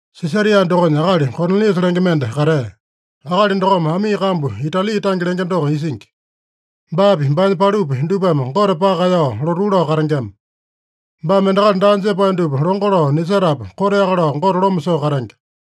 Sisaria dokonya akali Koniliasa lenge mende katea. Akali dokome amii kambu Itali tange lenge doko isingi. Baapi, baanya palupi, dupame Gote paka kaeyao lotuu lao katengema. Baame endakali daa jepae dupa longo lao nisetapu, koteaka lao Gote loma soo katenge.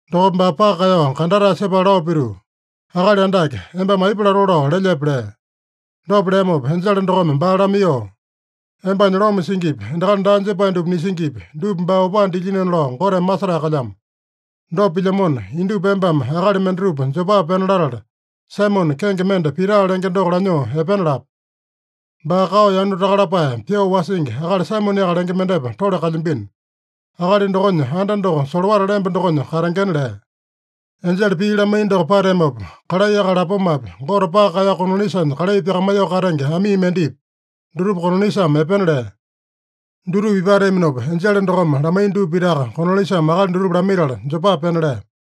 Dokopa baa paka kaeyao kandatae sepala lao pituu, “Akali Andake, embame aipa latoo lao lelyepe?” lea. Dopa leamopa enjele dokome baa lamaiyoo, “Embanya loma singipi, endakali daa jepae dupa nisingipi, dupa baa opaa dilyinona lao Goteme masetae kalyamo. Dopa pilyamona, indupa embame akali mendatupa Jopa pena latala, Saimone, kenge mende Pita lenge doko lanyoo epena lape. Baa kao yanu taka lapae pyoo wasingi akali Saimoneaka lenge mendepa tole kalyambino. Akali dokonya anda doko solowata lemba dokonya katengena” lea. Enjele pii lamaiya doko pateamopa, kalai akali lapomapi, Gote paka kaeyao Koniliasanya kalai pyakamaiyoo katenge amii mendepi, dutupa Koniliasame epena lea. Dutupa ipateaminopa, enjele dokome lamaiya dupa pitaka Koniliasame akali dutupa lamaitala, Jopa pena lea.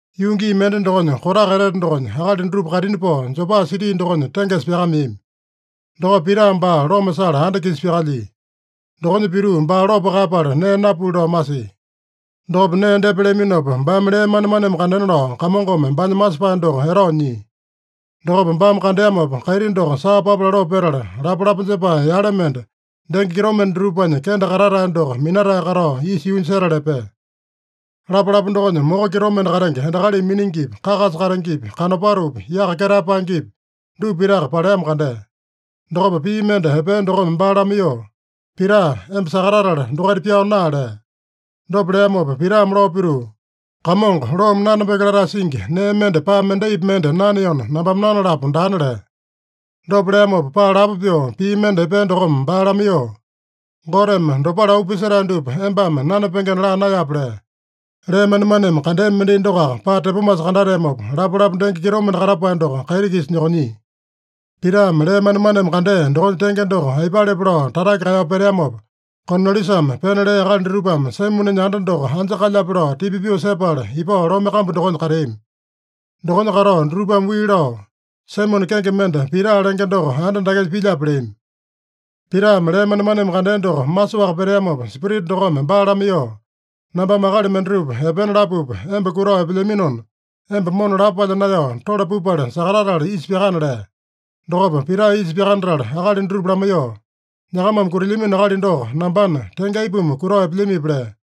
Yuu gii mende dokonya, kotaka etete dokonya, akali dutupa kaitini pao Jopa siti dokonya tengesa pyakameami. Dokopa Pita baa loma sala anda-kisa pyakalyia. Dokonya pituu baa lopo kaeyapala, nee napuli lao masia. Dokopa nee depa leaminopa, baame lee manemaneme kandena lao Kamongome baanya masepae doko etao nyia. Dokopa baame kandeamopa, kaiti doko saa papa laloo petala, lapalapa jepae yale mende, denge kitomende dutupanya kende katatae doko minatae katao, isa yuunya setala epea. Lapalapa dokonya moko kitomende katenge endakalimi miningipi, kakasa katengepi, kanopatopi, yaka ketae paengepi, dupa pitaka paleamo kandea. Dokopa pii mende epea dokome baa lamaiyoo, “Pita, emba sakatatala dokaita pyao naa” lea. Dopa leamopa Pitame lao pituu, “Kamongo, loome nanapenge latae singi nee mende paa mendaipi mende naneona, nambame nanalapo daana” lea. Dopa leamopa, paa lapo pyoo pii mende epea dokome baa lamaiyoo, “Goteme dopale auu pisetae dupa embame nanapengena laa naeyape” lea. Lee manemaneme kandea mendai dokoaka paa tepomasa kandateamopa, lapalapa denge kitomende katapae doko kaiti-kisa nyokonyia. Pitame lee manemaneme kandea dokonya tenge doko aipalepe lao tatake kaeyao peteamopa, Koniliasame pena lea akali dutupame Saimonenya anda doko anja kalyape lao tipa pyoo sepala, ipao lome kambu dokonya kateami. Dokonya katao dutupame wii lao, “Saimone kenge mende Pita lenge doko anda dakenya pilyape?” leami. Pitame lee manemaneme kandea doko masoaka peteamopa, Spirita dokome baa lamaiyoo, “Nambame akali mendatupa epena lapupa, emba kutao epelyaminona, emba mona lapo palya naeyao, tole pupale sakatatala isa pyakana” lea. Dokopa Pita isa pyakanatala akali dutupa lamaiyoo, “Nyakamame kutilyamino akali doko nambana, tenge aipuma kutao epelyamipi?” lea.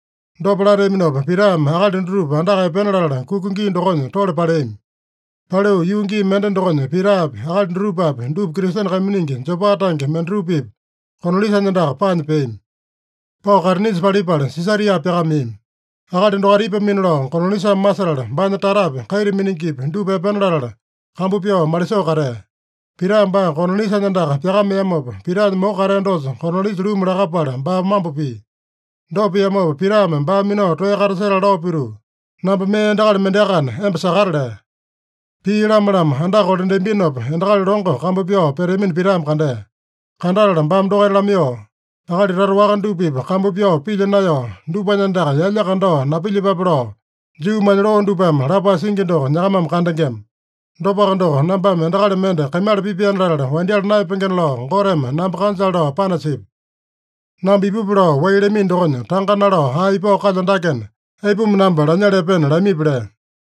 Dopa lateaminopa, Pitame akali dutupa andaka epena latala kuka gii dokonya tole paleami. Paliu yuu gii mende dokonya Pitapi, akali dutupapi, dupa Kristene kaiminingi Jopa tange mendatupa-pipa Koniliasanya andaka paanya peami. Pao kaitinisa palipala Sisaria pyakameami. Akali dokaita ipamino lao Koniliasame masetala, baanya tatapi, kaita miningipi dupa epena latala, kambu pyao malisoo katea. Pita baa Koniliasanya andaka pyakameamopa, Pitanya moko katea dosa Koniliasa luma lakapala baa mambo pia. Dopa piamopa, Pitame baa minao toeya katasetala lao pituu, “Namba mee endakali mendeakana, emba sakata” lea. Pii lama-lama andaka kolandeambinopa, endakali longo kambu pyao peteamino Pitame kandea. Kandatala baame dokaita lamaiyoo, “Akali tata waka dupa-pipa kambu pyao pilya naeyao, dupanya andaka yalya kandao napilyepape lao, Juumanya loo dupame lapae singi doko nyakamame kandengema. Dopaka doko, nambame endakali mende kaimala pipaena latala wandyala naeyapengena lao Goteme namba kanjale lao panasipya. Namba ipupi lao wai lamino dokonya, tanga nalao ae ipao kalyo dakena, aipuma namba lanyala epena lamipi?” lea.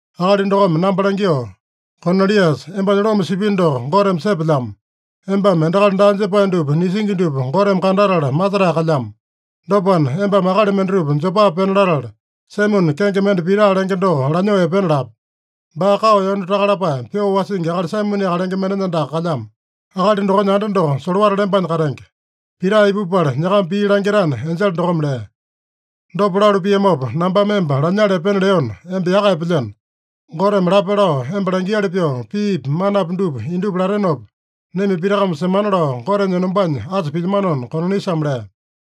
Akali dokome namba langyoo, ‘Koniliasa, embanya loma sipino doko Goteme sepelyamo. Embame endakali daa jepae dupa nisingi dupa Goteme kandatala masetae kalyamo. Dopana, embame akali mendatupa Jopa pena latala, Saimone kenge mende Pita lenge doko lanyoo epena lape. Baa kao yanu taka lapae pyoo wasingi akali Saimoneaka lenge mendenya andaka kalyamo. Akali dokonya anda doko solowata lembanya katenge. Pita ipupala nyakama pii langitana’ enjele dokome lea. Dopa lalu piamopa, nambame emba lanyala epena leona, emba yaka epelyeno. Goteme lape lao emba langiali pyoo piipi, manapi dupa indupa latenopa, naima pitakame semana lao Gotenya enombanya asa pilyamanona” Koniliasame lea.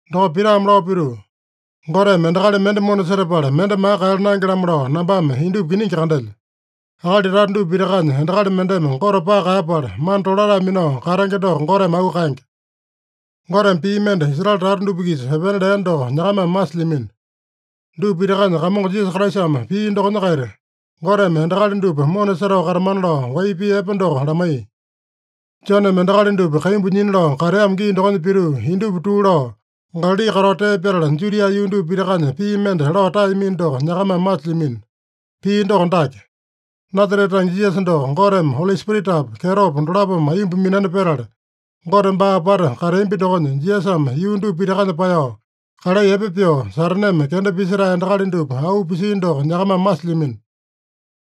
Dokopa Pitame lao pituu, “Goteme endakali mende mona setapala, mende maka kaeyala naenge-lamo lao nambame indupa kiningi kandelyo. Akali tata dupa pitakanya, endakali mendeme Gote paka kaeyapala, mana tolatae minao katenge doko Goteme auu kaenge. Goteme pii mende Israele tata dupa-kisa epena lea doko nyakamame masilyamino. Dupa pitakanya Kamongo Jisasa Kraisame pia dokonya-kaita, Goteme endakali dupa mona setao katamana lao wai pii epe doko lamaiya. Joneme endakali dupa kaimbu nyina lao kateamo gii dokonya pituu, indupa tuu lao, Galali katao tee pyatala, Judia yuu dupa pitakanya pii mende lao taeyamino doko nyakamame masilyamino. Pii doko dake: Nasarete tange Jisasa doko Goteme Oli Spiritapa, kyetopa dolapome aiyomba minani petala, Gote baa apata kateambi dokonya, Jisasame yuu dupa pitakanya paeyao kalai epe pyoo, Sataneme kenda pisetae endakali dupa auu pisia doko nyakamame masilyamino.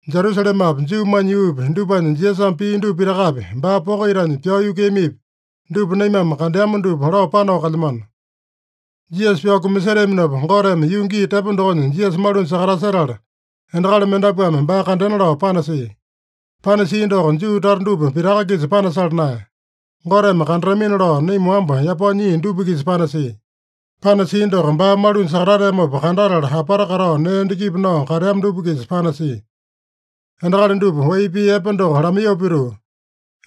Jerusalemapi, Juumanya yuupi, dupanya Jisasame pia dupa pitakapi, baa poko itanya pyao yukuiyamipi, dupa naimame kandeama dupa lao panao kalyamano. Jisasa pyao kumaseteaminopa, Goteme yuu gii tepo dokonya Jisasa malunya sakatasetala, endakali mendapuame baa kandena lao panasia. Panasia doko Juu tata dupa pitaka-kisa panasala naeya. Goteme kandatamina lao naima wamba yapao nyia dupa-kisa panasia. Panasia doko, baa malunya sakatateamopa kandatala apata katao nee endakipi nao kateama dupa-kisa panasia. Endakali dupa wai pii epe doko lamaiyoo pituu,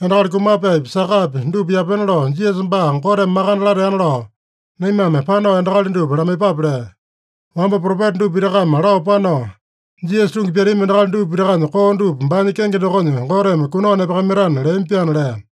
endakali kumapaepi, sakapi dupa yapena lao Jisasa baa Goteme makande lateana lao, naimame panao endakali dupa lamaiyepape lea. Wamba propeta dupa pitakame lao panao, Jisasa tungi pyatami endakali dupa pitakanya koo dupa baanya kenge dokonya Goteme kunao nepakamaitana leami-pyaana” lea.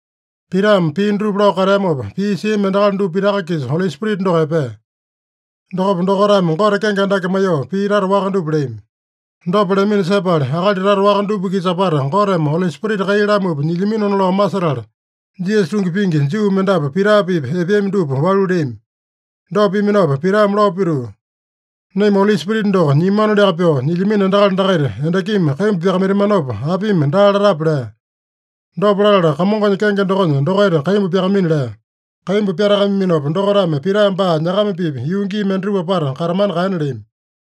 Pitame pii dutupa lao kateamopa, pii siami endakali dupa pitaka-kisa Oli Spirita doko epea. Dokopa dokaitame Gote kenge andake maiyoo pii tata waka dupa leami. Dopa leamino sepala, akali tata waka dupa-kisa apata Goteme Oli Spirita kai lamupa nyilyaminona lao masetala, Jisasa tungi pingi Juu mendapu Pita-pipa epeami dupa walu leami. Dopa piaminopa Pitame lao pituu, “Naima Oli Spirita doko nyiamanoliaka pyoo nyilyamino endakali dakaita endakimi kaimbu pyakamaitamanopa, apimi daa latape?” lea. Dopa latala Kamongonya kenge dokonya dokaita kaimbu pyakamaina lea. Kaimbu pyatakamaiyaminopa, dokaitame Pita baa nyakama-pipa yuu gii mendatupa apata katamana kaena leami.